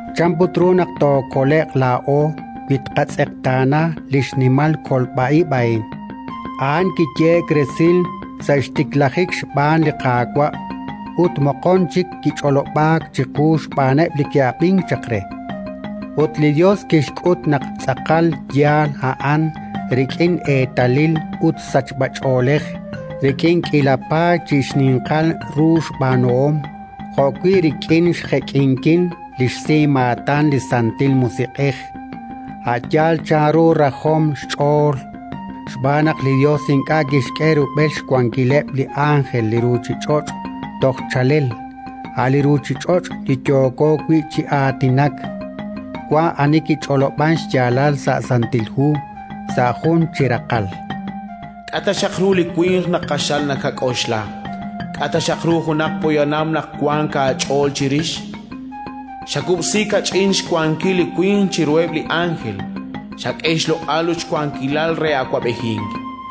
chan put ru naq tookole'q laa'o, wi tqatz'eqtaana li xnimal kolb'a ib' a'in? A'an kiyehe'k resil sa' xtiklajik xb'aan li Qaawa', ut moqon chik kich'olob'aak chiqu xb'aaneb' li ke'ab'ink chaq re. Ut li Yos kixk'ut naq tz'aqal yaal a'an rik'ineb' eetalil ut sachb'ach'oolej, rik'in k'iila paay chi xninqal ru xb'aanuhom, jo'wi' rik'in xjek'inkil li xsimaatan li Santil Musiq'ej, a' yaal chanru rajom xch'ool. Xb'aan naq li Yos ink'a' kixk'e rub'el xwankileb' li ánjel li ruuchich'och' toj chaalel, a' li ruuchich'och' li yooko wi' chi aatinak. Wank ani kich'olob'ank xyaalal sa' Santil Hu, sa' jun chi raqal: “K'a' ta xaq ru li winq naq q'axal nakak'oxla, k'a' ta xaq ru junaq poyanam naq wank aach'ool chirix? Xakub'si kach'in xwankil li winq chiruheb' li ánjel; xak'e xloq'al ut xwankilal re awab'ejink.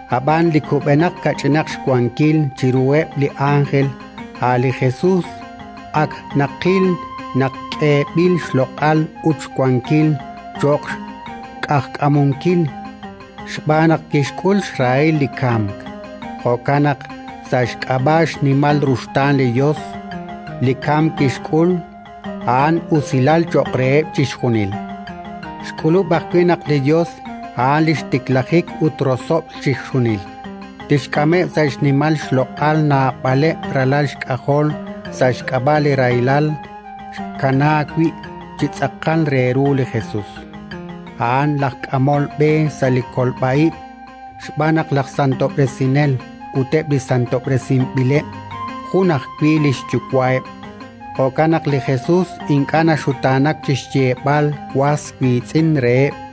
ab'an li kub'enaq kach'inaq xwankil chiruheb' li ánjel, a' li Jesus, ak naqil naq k'eeb'il xloq'al ut xwankil cho'q xq'ajkamunkil, xb'aan naq kixk'ul xrahilal li kamk. Jo'kan naq, sa' xk'ab'a' xnimal ruxtaan li Yos, li kamk kixk'ul, a'an usilal cho'q reheb' chixjunil. Xk'ulub' ajwi' naq li Yos, a'an li xtiklajik ut rosob'l chixjunil, tixk'ameb' sa' xnimal xloq'al naab'aleb' ralal xk'ajol sa' xk'ab'a' li rahilal xkanaak wi' chi tz'aqal re ru li Jesus, a'an laj k'amol b'e sa' li kolb'a ib'. Xb'aan naq laj santob'resinel ut eb' li santob'resinb'ileb' jun ajwi' li xYuwa'eb'. Jo'kan naq li Jesus ink'a' naxutaanak chi xyeeb'al was wiitz'in reheb',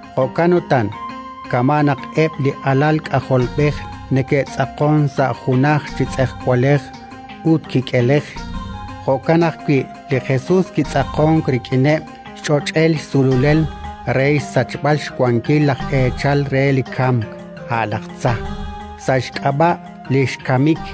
Jo'kan utan, kama' naq eb' li alal k'ajolb'ej neke'tz'aqonk sa' junaj chi tz'ejwalej ut kik'elej, jo'kan ajwi' li Jesus kitz'aqonk rik'ineb' xch'och'el xsululel re xsachb'al xwankil laj eechal re li kamk, a' laj tza, sa' xk'ab'a' li xkamik,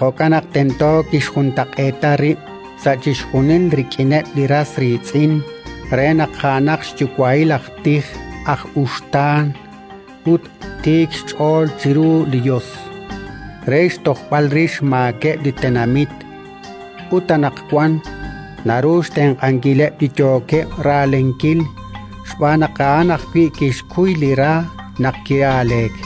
Jo'kan naq tento kixjuntaq'eeta rib' sa' chixjunil rik'ineb' li ras riitz'in re naq a'anaq xyuwa'il aj tij aj uxtaan ut tiik xch'ool chiru li Yos, re xtojb'al rix xmaakeb' li tenamit. Ut anaqwan naru xtenq'ankileb' li yookeb' raalenkil, xb'aan naq a'an ajwi' kixkuy li ra naq ki'aaleek.